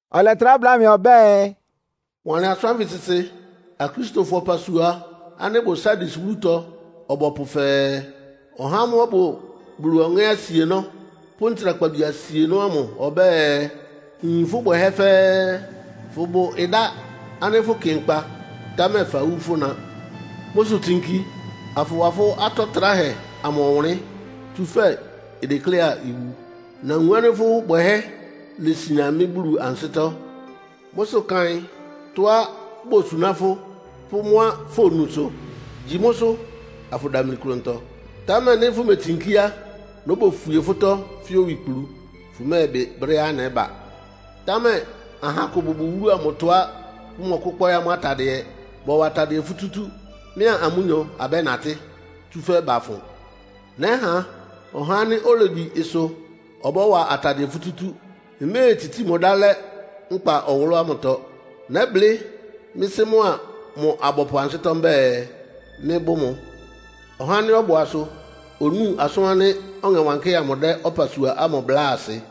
Ɔlɛtrá bláa mɩ ɔbɛ́ɛ, “Wanlɩn asʋ́n ánfɩ sɩsɩ Akristofɔ ɔpasua ánɩ́ ɩbʋ Sardis wúlutɔ ɔbɔpʋ fɛɛ, “Ɔhá ámʋ́ʋ́ ɔbʋ Bulu Ɔŋɛ́ asienɔ́ pʋ́ ntsrakpabi asienɔ́ ámʋ ɔbɛ́ɛ: Nyin fʋ́ bwɛhɛ́ fɛ́ɛ́. Fʋbʋ ɩdá ánɩ́ fʋkɩ nkpa, támɛ fawú fʋ́na. Mʋ́ sʋ tsinki, afʋwa fʋ́ atɔ tráhɛ amʋ ɔwʋnlɩ́n, tsúfɛ́ idekléá iwu. Nawun ánɩ́ fʋ́ bwɛhɛ́ lesian mɩ́ Bulu ansɩ́tɔ́. Mʋ́ sʋ kaɩn tɔ́á bosuná fʋ́ pʋ́ mʋ́á fonusʋ. Gyi mʋ́sʋ́, afʋdamli klʋntɔ. Támɛ nɩ́ fʋmetsinkí á, nóbofwie fʋ́tɔ́ fɛ́ owikplu, fʋ́mɛ́ɛbɩ brɛ́á nɛ́ba. Támɛ aha akʋ bʋbʋ wúlu amʋtɔá bʋmɔkʋ́kpɔ́ɩ́ amʋ́ atadɩɛ. Bɔ́wa atadɩɛ futútú, mɩ́a amʋ́nyɔ abɛ́natɩ́, tsúfɛ́ bafʋn. Nɛ́ha ɔhá ánɩ́ olegyi ɩsʋ ɔbɔ́wa atadɩɛ futútú. Mméetsitsíi mʋ ɩdá lɛ́ nkpa ɔwʋlʋ́ ámʋtɔ. Nɛ́blɩ́ mɩ́ Sɩ́ mʋa mʋ abɔpʋ ansɩ́tɔ́ mbɛ́ɛ, mɩ́bʋ́ mʋ. “Ɔhá ánɩ́ ɔbʋ asʋ onúu asʋn ánɩ́ Ɔŋɛ Wankɩ́hɛ́ amʋ dɛ́ ɔpasua ámʋ bláa asɩ.”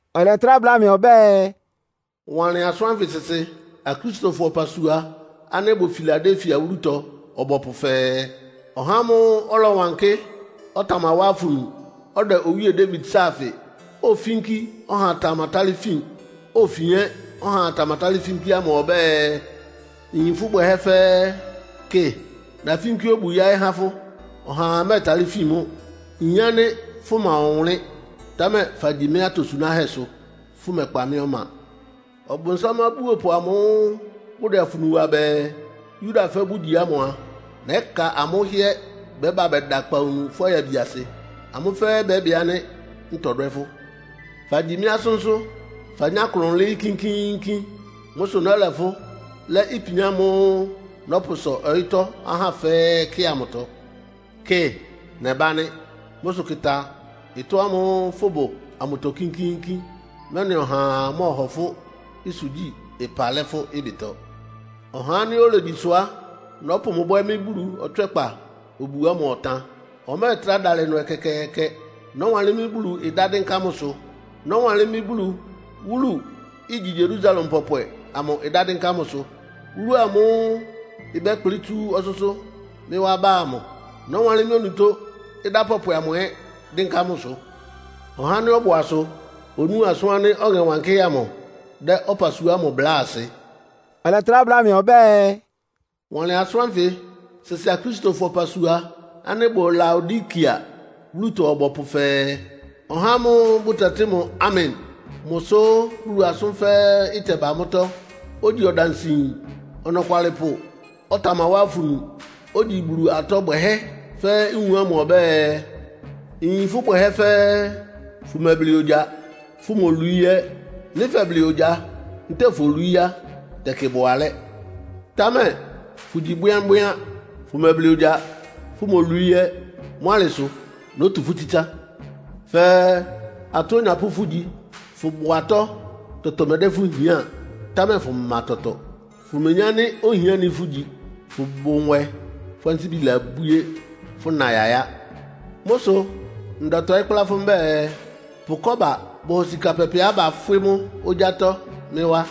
Ɔlɛtrá bláa mɩ ɔbɛ́ɛ, “Wanlɩn asʋ́n ánfɩ sɩsɩ Akristofɔ ɔpasua ánɩ́ ɩbʋ Filadelfia wúlutɔ ɔbɔpʋ fɛɛ, “Ɔhá ámʋ́ʋ́ ɔlɔwankɩ́, ɔtamawá afunu, ɔdɛ Owíe Dawid sáafɩ, ofínkí ɔhaa tamatálɩ́ fin, ofin ɛ́ ɔhaa tamatálɩ́ fínkí ámʋ ɔbɛ́ɛ: Nyin fʋ́ bwɛhɛ́ fɛ́ɛ́. Kɩ, nafínkí obu yáɩ́ há fʋ́. Ɔhaa mɛ́ɛtalɩ́ fin mʋ́. Nyin ánɩ́ fʋma ɔwʋnlɩ́n, támɛ fagyi mɩ́ atosunáhɛ́sʋ, fʋ́mɛkpa mɩ́ ɔma. Ɔbʋnsám abúopʋ amʋ́ʋ́ bʋdɛ afunu wa bɛɛ, Yudafɔ bʋgyi ámʋ a, nɛ́ka amʋ́ hɩ́ɛ́ bɛ́ba bɛda akpawunu fʋ́ ayabiasɩ. Amʋ́ fɛ́ɛ́ bɛ́bɩ ánɩ́ ntɔdwɛ́ fʋ́. Fagyi mɩ́ asʋ́nsʋ́, fanyá klʋn lɩ́ɩ́ kínkíínkín. Mʋ́ sʋ nɛ́lɛ fʋ́ lɛ́ ipian ámʋ́ʋ́ nɔ́pʋsɔ ɔyɩ́tɔ́ ahá fɛ́ɛ́ kɩ amʋtɔ. Kɩ, nɛbá nɩ́. Mʋ́ sʋ kɩ́tá ɩtɔ́ ámʋ́ʋ́ fʋ́bʋ amʋtɔ kínkíínkín, mɛ́nɩ ɔhaa mɔ́hɔ fʋ́ ɩsʋgyí-ɩpa lɛ́ fʋ́ ɩbɩtɔ. Ɔhá ánɩ́ olegyi ɩsʋ á, nɔ́pʋ mʋ bwɛ́ mɩ́ Bulu ɔtswɛ́kpa obu ámʋ ɔtan. Ɔmɛ́ɛtrá dalɩ ɩnʋ ɛkɛkɛɛkɛ. Nɔ́wanlɩ́n mɩ́ Bulu ɩdá dɩ́nká mʋsʋ. Nɔ́wanlɩ́n mɩ́ Bulu wúlu, igyi Yerusalem pɔpwɛ amʋ ɩdá dɩ́nká mʋsʋ. Wúlu ámʋ́ʋ́ ɩbɛ́kplɩ́ tsú ɔsʋ́sʋ́ mɩ́ wá ba amʋ, nɔ́wanlɩ́n mɩ́ onutó ɩdá pɔpwɛ amʋ ɛ́ dɩ́nká mʋsʋ. “Ɔhá ánɩ́ ɔbʋ asʋ onúu asʋn ánɩ́ Ɔŋɛ Wankɩ́hɛ́ amʋ dɛ́ ɔpasua ámʋ bláa asɩ.” Ɔlɛtrá bla mɩ ɔbɛ́ɛ, “Wanlɩn asʋ́n ánfɩ sɩsɩ Akristofɔ ɔpasua ánɩ́ ɩbʋ Laodikea wúlutɔ ɔbɔpʋ fɛɛ, “Ɔhá ámʋ́ʋ́ bʋtɛtɩ́ mʋ Amen, mʋ sʋ́ Bulu asʋ́n fɛ́ɛ́ ɩtɛba mʋ́tɔ́, ogyi ɔdansɩyin ɔnɔkwalɩpʋ, ɔtamawá afunu, ogyi Bulu atɔ bwɛhɛ́ fɛ́ɛ́ nwun ámʋ ɔbɛ́ɛ: Nyin fʋ́ bwɛhɛ́ fɛ́ɛ́. Fʋmɛblɩ ogya, fʋ́molwií ɛ́. Nɩ́ fɛblɩ ogya ntɛ́ɛ folwií á, tɛkɩ ɩbʋ alɛ́. Támɛ fʋgyi bwɩ́ánbwɩ́án, fʋmɛblɩ ogya, fʋmolwií ɛ́. Mʋ́ alɩ sʋ nótu fʋ́ tsítsá. Fɛɛ, atɔ onyapʋ́ fʋgyi, fʋ́bʋ atɔ́. Tɔtɔ mɛ́dɛ́ fʋ́ hián, támɛ fʋma tɔtɔ, fʋmeyín ánɩ́ ohiáni fʋ́gyi. Fʋbʋ nwɛ, fʋ́ ansíbi labwíé, fʋ́na yayá. Mʋ́ sʋ ndɛtɔɩ́ kplá fʋ́ mbɛ́ɛ, pʋ kɔ́ba bɔhɔ sika pɛpɛá bafwɩ́ mʋ́ ogyátɔ́ mɩ́ wá.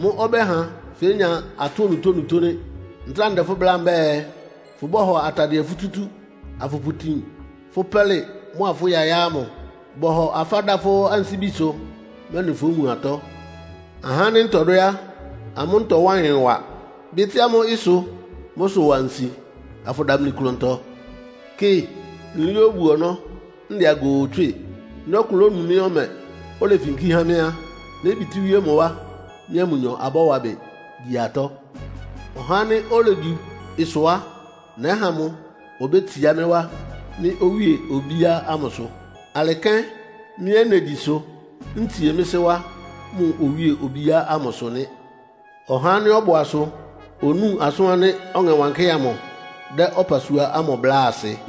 Mʋ́ ɔbɛ́ha fénya atɔ́ onutónutó nɩ́. Ntráa ndɛ fʋ́ bláa mbɛ́ɛ, fʋbɔ́hɔ atadɩɛ futútú, afʋpʋtin fʋ́ pɛ́lɩ mʋ́a fʋ́ yayá ámʋ. Bɔhɔ afá da fʋ́ ansíbisʋ, mɛ́nɩ fówun atɔ́. Ahá ánɩ́ ntɔdwɛ́ á, amʋ́ ntɔwá ɩyɩn wa, bɩ́tɩ́ amʋ́ ɩsʋ. Mʋ́ sʋ wa nsi, afʋdamli klʋntɔ. Kɩ, nlɩɩ́ obu-ɔnɔ́, ndɛ agoo tswɩ́ɩ. Nɩ́ ɔkʋ lónu mɩ́ ɔmɛ, olefinkí há mɩ́ á, nébitíwíé mʋ wá, mɩ́a mʋnyɔ abɔ́wa ɩbɩ gyi atɔ́. Ɔhá ánɩ́ olegyi ɩsʋ á, nɛ́ha mʋ obétsiá mɩ́ wá, mɩ́ owíe obíá ámʋsʋ. Alɩ kɛ́n mɩ́ ɛ́ negyi ɩsʋ, ntsie mɩ́ Sɩ́ wá mʋ owíe obíá ámʋsʋ nɩ́. “Ɔhá ánɩ́ ɔbʋ asʋ onúu asʋn ánɩ́ Ɔŋɛ Wankɩ́hɛ́ amʋ dɛ́ ɔpasua ámʋ bláa asɩ.”